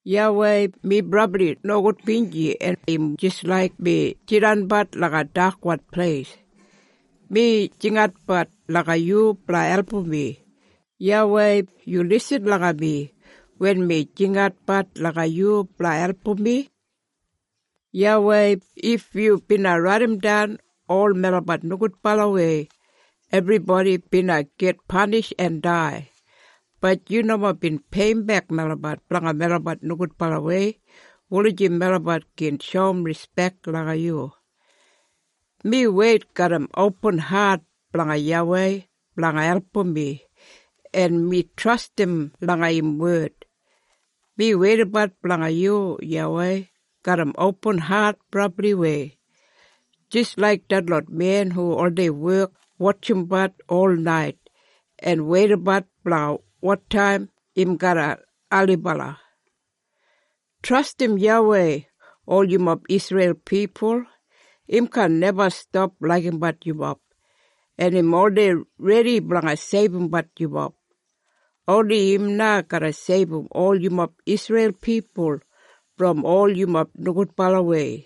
YAWEI, mi brabli nogudbinji en im jis laik mi jidanabat langa dakwan pleis. Mi jinginatbat langa yu blanga album mi. YAWEI, yu lisin langa mi wen mi jinginatbat langa yu blanga album mi. YAWEI, if yu bina raidimdan ol melabat nogudbalawei, ebribodi bina git panish en dai. Bat yu nomo bin peiyimbek melabat blanga melabat nogudbalawei, wulijim melabat gin shoum rispek langa yu. Mi weit garram opin hat blanga YAWEI blanga album mi, en mi trastim langa im wed. Mi weidabat blanga yu YAWEI garram opin hat brabliwei, jis laik detlot men hu oldei wek wotjimbat olnait, en weidabat blanga wotaim im garra ailibala. Trastim YAWEI ol yumob Isreil pipul. Im kaan neba stap laigimbat yumob, en im oldei redi blanga seibumbat yumob. Oni im na garra seibum ol yumob Isreil pipul brom ol yumob nogudbalawei.